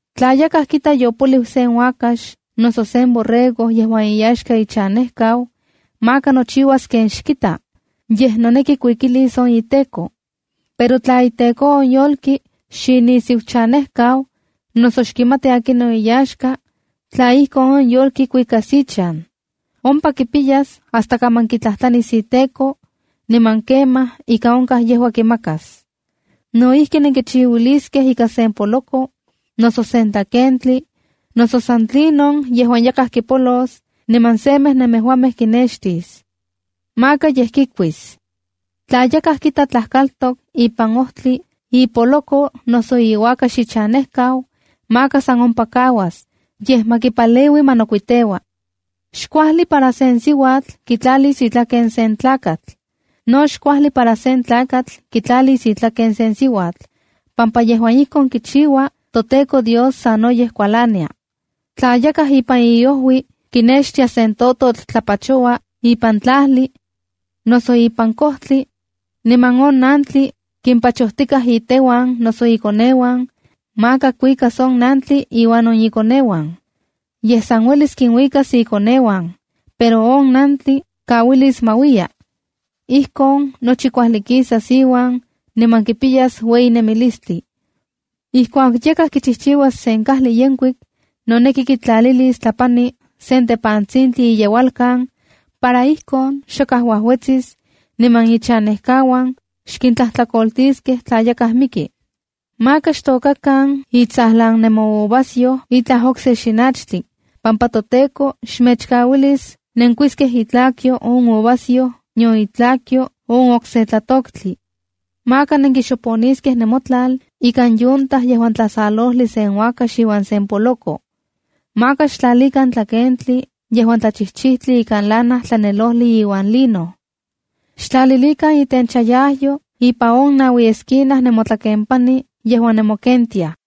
’Tla yakaj kita yopoliu sen uakax noso sen borrego yejuan iyaxka ichanejkau, maka nochiuas ken xkita, yej noneki kuikilis on iteko. Pero tla iteko on yolki xinisiuchanejkau, noso xkimati akinon iyaxka, tla ijkon, on yolki kuikas ichan. Ompa kipiyas hasta kaman kitlajtlanis iteko, niman kemaj ika onkaj yejua kimakas. No ijki, nenkichiuaskej ika sen poloko, noso sen tlakentli, noso san tlinon yejuan yakaj kipolos niman semej nemejuamej kinextis. Maka yej kikuis. ’ Tla yakaj kita tlajkaltok ipan ojtli ipoloko noso iuakax ichanejkau, maka san ompa kauas, yej ma kipaleui ma nokuiteua. ’Xkuajli para sen siuatl kitlalis itlaken sen tlakatl. No xkuajli para sen tlakatl kitlalis itlaken sen siuatl, pampa yejuan ijkon kichiua toTEKO Dios sanoyej kualania. ’Tla yakaj ipan iojui kinextia sen tototl tlapachoua ipan tlajli, noso ipan kojtli, niman on nantli kimpachojtikaj iteuan noso ikoneuan, maka kuikas on nantli iuan on ikoneuan. Yej san uelis kinuikas ikoneuan, pero on nantli kauilis ma uiya. Ijkon nochi kuajli kisas iuan, niman kipiyas ueyi nemilistli. ’Ijkuak yakaj kichijchiuas sen kajli yenkuik, noneki kitlalilis tlapani sen tepantsintli iyeualkan, para ijkon xakaj uajuetsis, niman ichanejkauan xkintlajtlakoltiskej tla yakaj miki. ’Maka xtôkakan itsajtsajlan nemouvasyoj itlaj okse xinachtli, pampa toTEKO xmechkauilis nenkuiskej itlakyo on uvasyoj nion itlakyo on okse tlatoktli. ’Maka nenkixoponiskej nemotlal ikan yunta yejuan tlasalojli sen uakax iuan sen poloko. ’Maka xtlalikan tlakentli yejuan tlachijchijtli ikan lana tlanelojli iuan lino. ’Xtlalilikan itenchayajyo ipan on naui esquina nemotlakenpani yejuan nemokentiaj.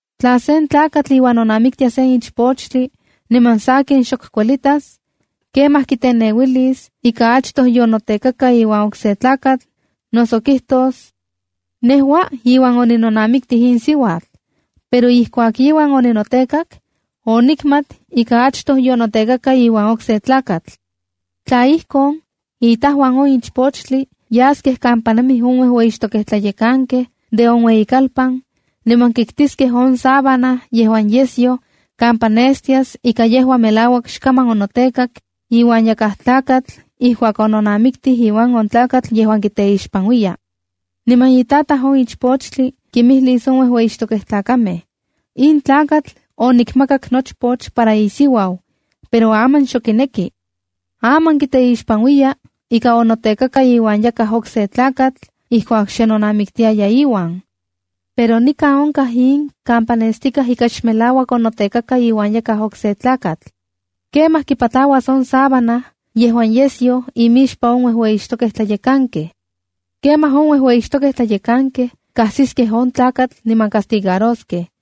’Tla sen tlakatl iuan nonamiktia sen ichpochtli, niman sakin, xok kuelitas, kemaj kiteneuilis ika achtoj yonotekaka iuan okse tlakatl, noso kijtos: “Nejua iuan oninonamiktij in siuatl, pero ijkuak iuan oninotekak, onikmat ika achto yonotekaka iuan okse tlakatl.” Tla ijkon, itajuan on ichpochtli yaskej kampa nemij on uejueyixtokej tlayekankej de on ueyikalpan niman kiktiskej on sábana yejuan yesyo kampa nestias ika yejua melauak xkaman onotekak iuan yakaj tlakatl ijkuak ononamikti iuan on tlakatl. Niman itataj on ichpochtli kimijlis on uejueyixtokej tlayekankej: “In tlakatl onikmakak nochpoch para isiuau, pero aman xok kineki. Aman kiteixpanuiya ika onotekaka iuan yakaj okse tlakatl ijkuak xe nonamiktia iuan. Pero nikan onkaj in kampa nestikaj ika melauak xonotekaka iuan yakaj okse tlakatl.” Kemaj kipatlauas on sábana yejuan yesyoj imixpan on uejueyixtokej tlayekankej. Kemaj on uejueyixtokej tlayekankej kajsiskej on tlakatl niman castigaroskej.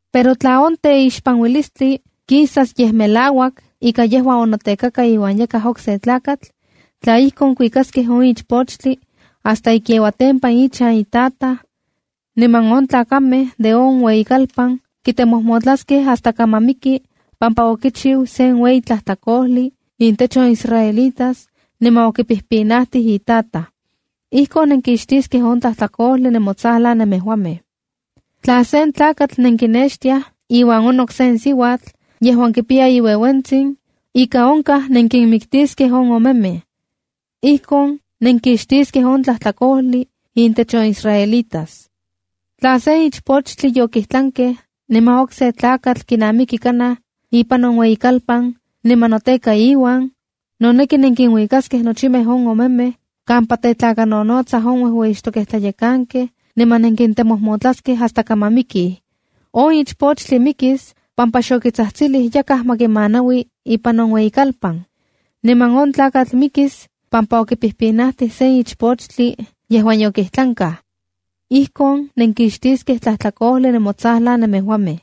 ’Pero tla on teixpanuilistli kisas yej melauak ika yejua yonotekaka iuan yakaj okse tlakatl, tla ijkon, kuikaskej on ichpochtli hasta ikiauatempan ichan itataj, niman on tlakamej de on ueyikalpan kitemojmotlaskej hasta kaman miki pampa okichiu sen ueyi tlajtlakojli intech on israelitas niman okipijpinajtij itataj. Ijkon nenkixtiskej on tlajtlakojli nemotsajlan nemejuamej. ’Tla sen tlakatl nenkinextiaj iuan onok sen siuatl yejuan kipiya iueuentsin, ika onkaj nenkinmiktiskej on omemej. Ijkon nenkixtiskej on tlajtlakojli intech on israelitas. ’Tla sen ichpochtli yokijtlankej niman okse tlakatl kinamiki kanaj ipan on ueyikalpan niman noteka iuan, noneki nenkinuikaskej nochimej on omemej kampa tetlakanonotsaj on uejueyixtokej tlayekankej niman nenkintemojmotlaskej hasta kaman mikij. On ichpochtli mikis pampa xokitsajtsilij yakaj ma kimanaui ipan on ueyikalpan. Niman on tlakatl mikis pampa okipijpinajtij sen ichpochtli yejuan yokijtlankaj. Ijkon nenkixtiskej tlajtlakojli nemotsajlan nemejuamej.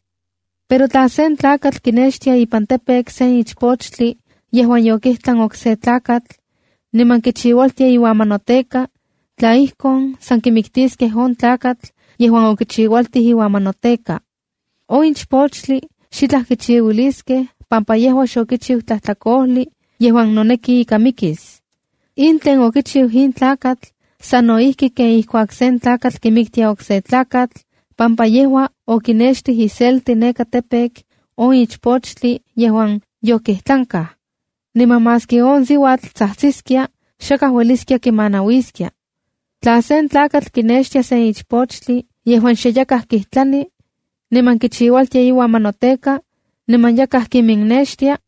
’Pero tla sen tlakatl kinextia ipan campo sen ichpochtli yejuan yokijtlan okse tlakatl, niman kichiualtia iuan ma noteka, tla ijkon, san kimitiskej on tlakatl yejuan okichiualtij iuan ma noteka. On ichpochtli xitlaj kichiuiliskej pampa yejua xokichiu tlajtlakojli yejuan noneki ika mikis. In tlen okichiu in tlakatl sano ijki ken ijkuak sen tlakatl kimiktia okse tlakatl, pampa yejua okinextij iselti neka campo on ichpochtli yejuan yokijtlankaj, niman maski on siuatl tsajtsiskia, xakaj ueliskia kimanauiskia. ’Tla sen tlakatl kinextia sen ichpochtli yejuan xe yakaj kijtlani, niman kichiualtia iuan ma noteka, niman yakaj kiminnextia,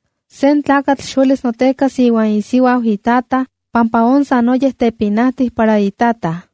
’Sen tlakatl xuelis notekas iuan isiuau itataj pampa on sanoyej pinaualistli para itataj.